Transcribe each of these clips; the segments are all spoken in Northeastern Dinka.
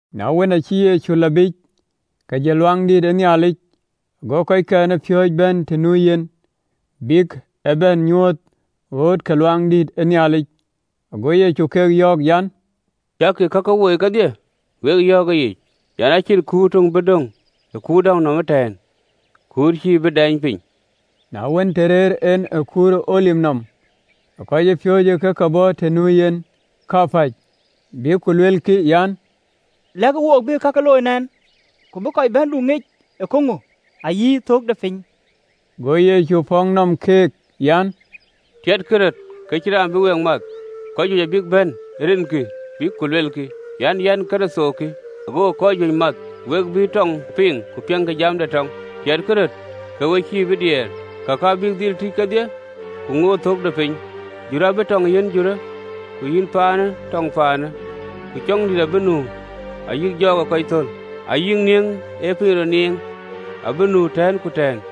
Na wën, aacï Yecu lɔ biic, ke jël Luaŋdït, go kɔckɛn ë piööcë bɛ̈n të nu yen, bïk ë bɛ̈n nyuöth ɣööt ke Luaŋdït. Go Yecu ke yɔ̈ɔ̈k an, “Cäkï kakë woi kedhie? Wek yɔ̈ɔ̈k ëyic an, acïn kuur töŋ bï döŋ ë kuur däŋ nɔm ee tënë, kuur cï bïï dɛɛny piny.” Na wën, të rëër en ë kuur ë Olip nɔm, ke kɔcpiööcë ke ke bɔ̈ të nu yen kapäc, bïk ku luelkï an, “Lɛ̈kë wook, bï kake röt looi nɛn? Ku kë bï kɔc bɛ̈ndu ŋic ee käŋö, ayï thök de piny?” Go Yecu pɔ̈k nɔm keek an, “Tiɛtkï röt ke cïn raan bï week math. Kɔc juëc abïk bɛ̈n ë rinkï, bïk ku luelkï an, ‘Yɛn Kërtho kï, agokï kɔc juëc math. Ku we bï tɔɔŋ piŋ ku piɛŋkï jam de tɔɔŋ, tiɛtkï röt ke we cïï bï diɛɛr, kakë abïk dhil tïc kedhie, ku ŋoot thök de piny. Jurë abï tɔŋ yiɛ̈n jurë, ku yïn ciɛɛŋë tɔŋ ciɛɛŋë, ku cɔŋdït abï nu, ayï jɔɔk ë kɔc thöl, ayï nieŋ ye piny rɔt niɛŋ, abïk nu tɛ̈ɛ̈n ku tɛ̈ɛ̈n.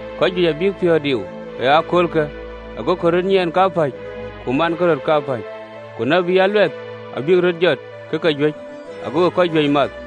Kɔc juëc abïk piɔ̈ɔ̈th diu ë aköölkë, agokï röt nyiɛɛn kapäc, ku mankï röt kapäc. Ku tït aluɛth abïk röt jɔt ke ke juëc, agokï kɔc juëc math.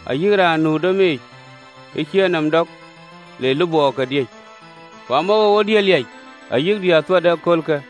Ayï raan nu ë domic, ë cïï enɔm dɔk le lupɔɔke diëc. Ku amawoou ë diëër liac ayï diëër thuat ë aköölkë!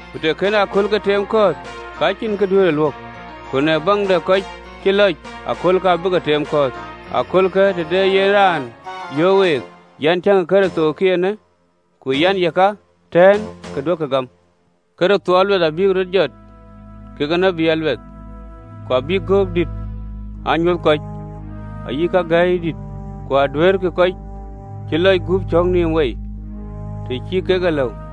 Ku të kënë aköölkë teem kɔ̈ɔ̈th, ka cïn kɔc duëërë luök, ku në baŋ de kɔc cï lɔc, aköölkë abï ke teem kɔ̈ɔ̈th. “Ë aköölkë, të de yen raan yöök week an, ‘Tiëŋkï, Kërtho kï eenë! Ku an, Yeka ëtɛ̈ɛ̈n! Ke duökï gam. Kërtho aluɛth abïk röt jɔt kekë tït aluɛth, ku abïk göök dït aa nyuöth kɔc, ayï kagɛ̈iyë ke dït, ku aduëërkï kɔc cï lɔc gup cɔ̈k nïïm wei, të cï kek e lëu.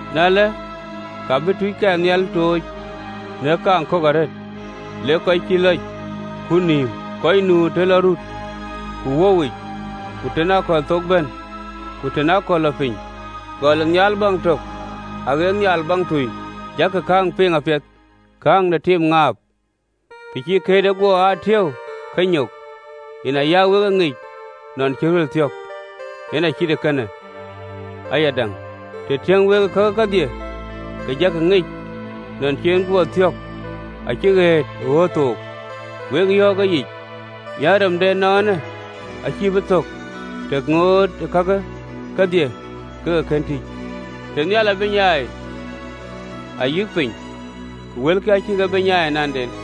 Na ëlë, abï tuuckɛn nhial tooc në kaaŋ kök arëët, lek kɔc cï lɔc kut nïïm, kɔc nu të lɔ rut, ku wöuwic, ku të lɔ aköl amiäk, ku të lɔ aköl athɛ̈i, gɔl ë nhial baŋ tök aɣët nhial baŋ tui. Jakï kääŋ piŋ apiɛth, kääŋ de tim ë ŋaap, të cï këërde guɔ aa tiëu, ke nyok, yen aya wek e ŋic nɔn cï deŋ amäi thiɔ̈k. Yen acït ee kënë ayadäŋ, të tiëŋ wek kakë kedhie, ke jakï ŋic nɔn cï en guɔ thiɔ̈k, acï ɣëët ë ɣööt thook. Wek yɔ̈ɔ̈k ëyic an, Rem de ënɔɔnë acï bï thök, të ŋootë kakë kedhie ke ke kën tïc. Tënhial abï nyai ayï piny, ku wëlkï acïkï bï nyai ananden.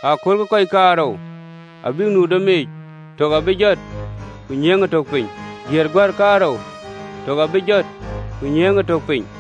Ëköölë kɔc kaarou abïk nu domic, tök abï jɔt, ku nyiëëŋë tök piny. Diëër guär kaarou, tök abï jɔt, ku nyiëëŋë tök piny.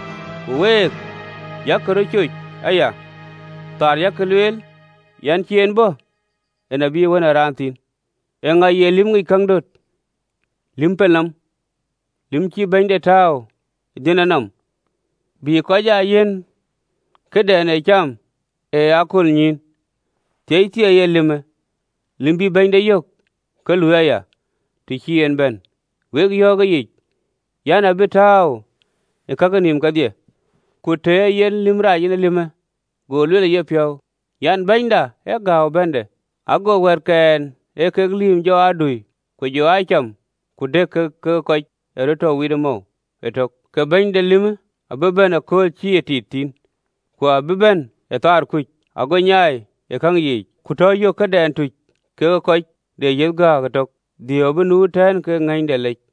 Ku week, yak röt coc aya, thaar yak lueel an, cïï en bɔ̈, en abï Wën ë Raan thïn. Eeŋa ye lïm ŋic käŋ döt, lïm pelnɔm, lïm cïï bɛ̈nyde tääu ë dhiënde nɔm, bï kɔc aa yiɛ̈n këdɛn ee cam ë aköölnyïïn? Thieithieei ë lïmë, lïm bïï bɛ̈nyde yök ke lui aya, të cï en bɛ̈n. Wek yɔ̈ɔ̈k ëyic an, abï tääu ë kake nïïm kedhie. Ku të ee yen lïm rac, en ee lïmë, go lueel ë yepiɔ̈u an, Bɛ̈nyda ë gääu ë bɛ̈nde, go wɛ̈ɛ̈tkɛn ee kek lïïm jɔ aa dui, ku jɔ aa cam ku dëk kekë kɔc ye mɔ̈u wit ëtök, ke bɛ̈ny de lïmë abï bɛ̈n ëkööl cïï ye tit thïn, ku abï bɛ̈n ë thaar kuc, ago nyaai ë käŋ yiic, ku tɔ yök këdɛn tuc kekë kɔc de yäc aguk ëtök, dhiëëu abï nu ëtɛ̈ɛ̈n kekë ŋëny de lec.